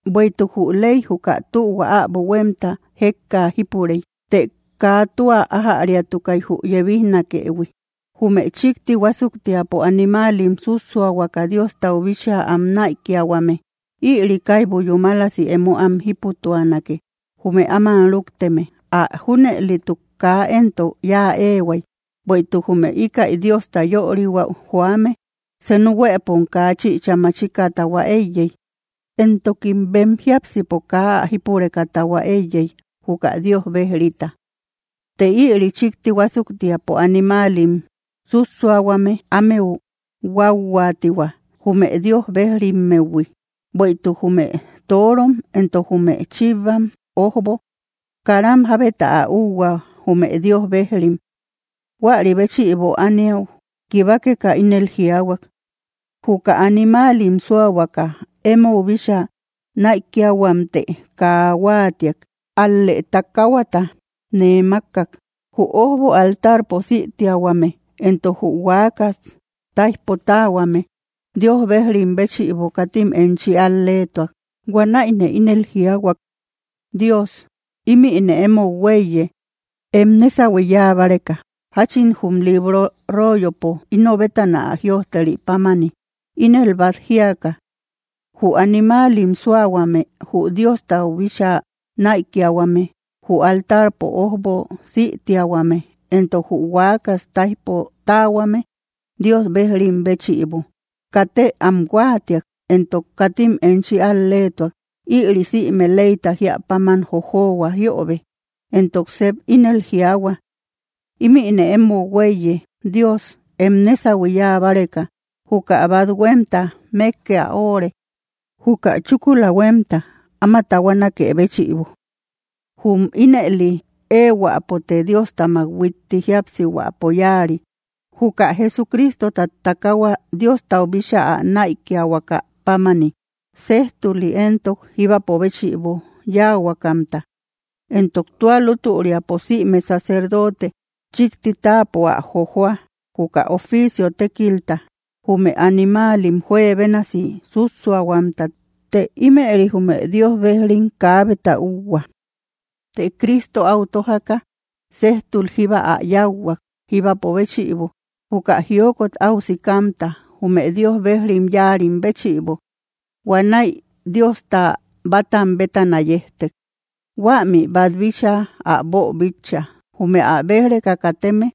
Bueïtuk jü ley juka tühua äbo huémta jékka jípurey, të kaa tua ájäriatukay jü yebijnakeïhui. Jume chíkti huásuktiapo animaalim sússuahuaka Diostau bíchaa am näikiahuame, ïri kaibu yúmalasi emo am jíputuanake, jume áman rúkteme. Ä junëlituk kaa éntok yáa éehuay, bueïtuk jume íkäi Diosta yörihuäu joame senu huëpom kaa chïcha machika tahua éiyey, entokim bem jiápsipo kaa ä jípureka tahua éiyey, juka Dios bejrita. Të ïri chíkti huásuktiapo animaalim sússuahuame, ámeu huauhuaatihua, jume Dios bejrihuammehui. Bueïtuk jume torom entok jume chivam ójbo karam jábeta ä úuhua, jume Dios bejrim. Huäri béchïbo ániau kibakeka, ínel jiaahuak: Juka animaalim súahuaka emou bíchaa näikiahuamtë kaa huáatiak, ál‑lë takaahuata nee mákkak. Jü ójbo altarpo sïtiahuame entok jü huakas táijpo táahuame Dios bejrim béchïbo, katim enchi al‑leetuak. Huanäine ínel jiaahuak: “Dios, ímïne emou huéiye, em nésahui yáa báreka, jáchin jum libro royopo ino bétana ä jïojteri pámani.” Ínel bát jíaka: “Jü animaalim súahuame, jü Diostau bíchaa näikiahuame, jü altarpo ójbo sïtiahuame entok jü huakas táijpo táahuame Dios bejrim béchïbo, katë am huáatiak entok katim enchi al‑leetuak; ïri sïme leyta jíä páman jojohua jiöbe.” Entok sep ínel jiaahua: “Ímïne emou huéiye, Dios, em nésahui yáa báreka. Juka bát huémta mékke ä óóre, juka chúkula huémta áma tahuanaké béchïbo.” Jum ínëli éehuäpote Diostamak huitti jíapsihuäpo yáari, juka Jesucristota takaahua Diostau bíchaa ä näikiahuaka pámani, séjtuli entok jíbapo béchïbo yáahuakamta. Entok tua lútüriapo sïme sacerdote chíkti táapo ä jojóa, juka oficio tékilta, jume animaalim juebénasi sússuahuamta; të ímëri jume Dios bejrim kaabeta úuhua. Të Cristo, áu tójaka séjtul jíba ä yáuhuak, jíbapo béchïbo, juka jiokot áu sikamta, jume Dios bejrim yáarim béchïbo. Huanäi Diosta bátam bétana yejtek. Huämi bát bíchaa ä boobíchaïhui, jume ä béj‑reka kateme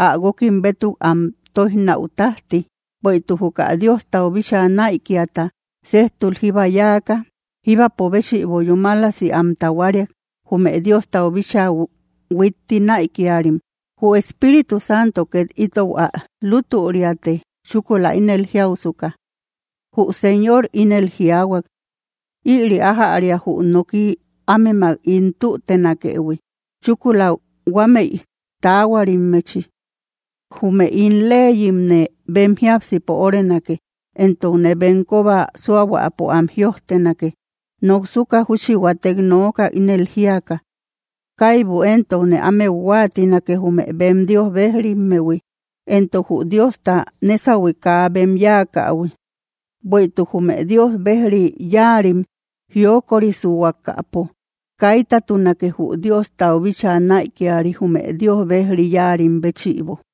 ä guókim bétuk am tóijnäu tájti. Bueïtuk juka Diostau bíchaa näikiata séjtul jíba yáaka, jíbapo béchïbo yúmalasi am tahuariak, jume Diostau bíchaa huitti näikiarim. Jü Espíritu Santo két itou ä lútüriate, chúkula ínel jiausuka: Jü Señor ínel jiaahuak: Ïri ájäria jü noki ámemak ín tütenakëhui, chúkula huamei taahuarimmechi. Jume ín leyimne bem jiápsipo órenake, entokne bem kóba súahuapo am jïojtenake. Noksuka júchi huatek nooka, ínel jíaka: Kaibu éntokne ámeu huáatinake, jume bem Dios bejrimmehui entok jü Diosta nésahui kaa bem yáakähui. Bueïtuk jume Dios bejri yáarim jiokorisuhuakapo, kaitatunake, jü Diostau bíchaa näikiari jume Dios bejri yáarim béchïbo.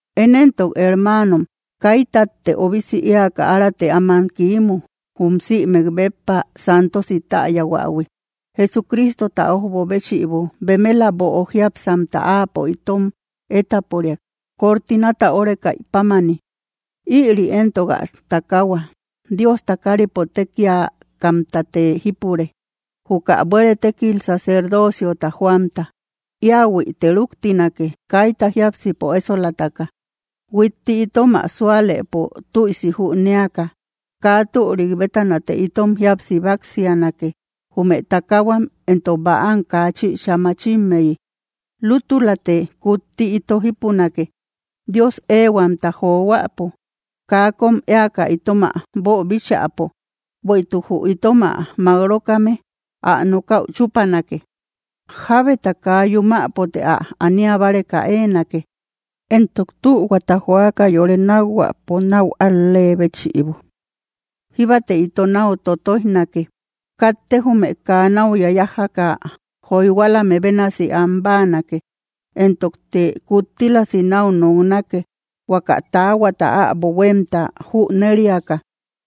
Én éntok hermaanom, kaitatte obisi éaka arate áman kiimu, jum sïmek béppa santosi täyahuähui, Jesucristota ójbo béchïbo. Bemela böo jiápsamta Áapo itom étaporiak, cortinata órekaï pámani. Ïri éntok ä takaahua. Diosta káripo tékiakamtate jípure, juka buére tékil sacerdoociota joamta. Íahuite rúktinake, kaita jiápsipo ésolataka, huitti itom ä súalëpo tuïsi jünéaka. Kaa türik bétanate itom jíapsi báksianake; jume takahuam éntok bäam kaa chïcha machimmeyi. Lútülate kutti ito jípunake, Dios éehuamta johuäpo, kaa kom éaka itom ä boobíchäpo, bueïtuk jü itom ä mák-rókame, ä nokäu chúpanake. Jábeta kaa yumäpote ä ania báreka éenake, entok tühuata joaka yore nákhuäpo, náu al‑lee béchïbo. Jíbate ito náu totoijnake; katte jume kaa náu yayajaka joyhualame bénasi am báanake; entokte kuttílasi náu noknake, huaka taahuata äbo huémta jüneriaka.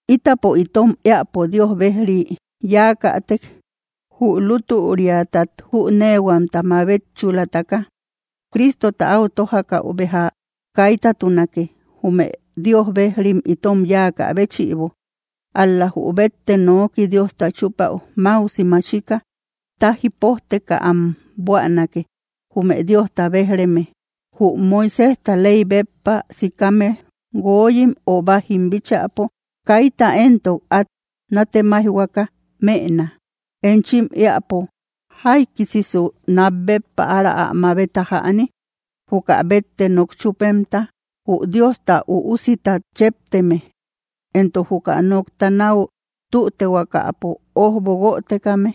Ítapo itom éäpo Dios bejrik yáakätek, jü lútüriatat jüneehuamta mabetchulataka, Cristota áu tójakäu béja kaitatunake, jume Dios bejrim itom yáakä béchïbo. Ál‑la jü bette noki Diosta chúpäu máusi machika, táji pójteka am buänake, jume Diosta béj‑reme. Jü Moiséjta ley béppa sikame guoyim ö bájim bíchäpo, kaita éntok át nátemaijhuaka mëna. Enchim éäpo, ¿jaikisisu nat béppa ára ä mabeta jäni, juka bette nok chúpemta, jü Diosta Üusitat chepteme, entok juka nokta náu tütehuakapo ójbo guötekame,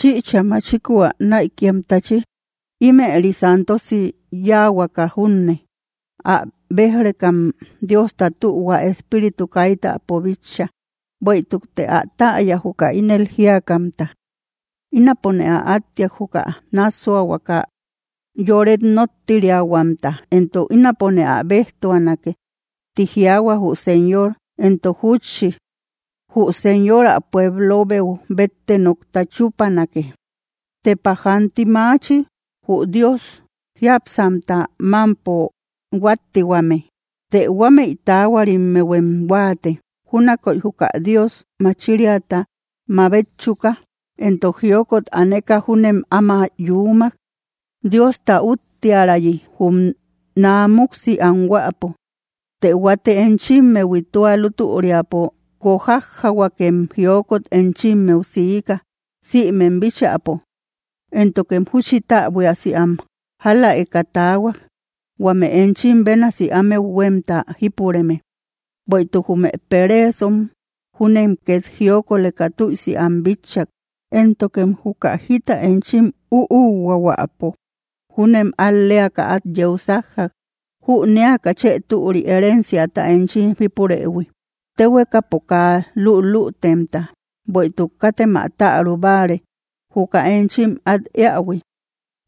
chïcha machiku ä näikiamtachi? Ímëri santosi yáahuaka junne. ¡Ä béj‑rekam, Diosta tühua Espíritu kaitäpo bitcha! Bueïtukte ä täya, juka ínel jíakamta: “Ínapone ä áttiak, juka nássuahuaka yoret nóttiriahuamta, entok ínapone ä béjtuanake”, ti jiaahua jü Señor. Entok júchi: “Jü Señor ä pueblobeu bette nokta chúpanake.” ¡Tepa jaanti maachi, jü Dios jiápsamta mámpo huáttihuame! Të huámëi taahuarimmehuem huáate, júnakoy juka Dios machiriata mabetchuka. Entok jiokot aneka júnem áma yuumak, Diosta úttiärayi jum naamuksi anhuäpo. Të huate enchimmehui, tua lútüriapo guojajjahuakem jiokot enchimmeu siika, sïmem bíchäpo, éntokem júchi täbuiasi am jáläeka taahuak, huame enchim bénasi ámeu huémta jípureme. Bueïtuk jume pereesom júnem két jiokoleka tüisi am bitchak, éntokem juka jita enchim úuhuahuäpo júnem al‑leaka át yeu sájjak, jünéaka chë türi herenciata enchim jípurëhui, téhuekapo kaa lülütemta. Bueïtuk katem ä täru báare, juka enchim át éähui;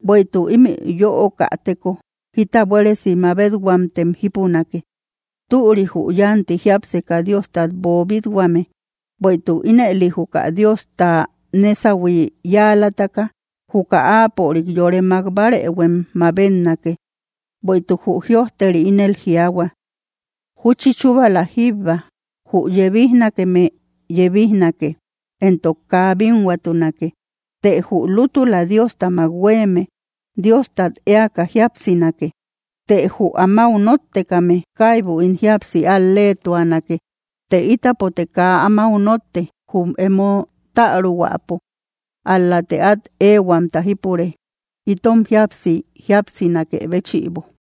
bueïtuk ímï yöokäteko jita buéresi mabethuamtem jípunake. Türi, jü yánti jiápseka Diostat boobit-huame, bueïtuk ínëli juka Diosta nésahui yáalataka, juka Áapörik yore mák bárëhuem mabetnake. Bueïtuk jü jïojteri ínel jiaahua: Júchi chúbala jíbba, jü yebijnakeme yebijnake, entok kaa bínhuatunake. Të jü lútula Diostamak huéeme Diostat éaka jíapsinake; të jü amáu nóttekame kaibu ín jíapsi al-leetuanake. Të ítapote kaa amáu notte, jum emo täruhuäpo, ál‑late át éehuamta jípure, itom jíapsi jíapsinakë béchïbo.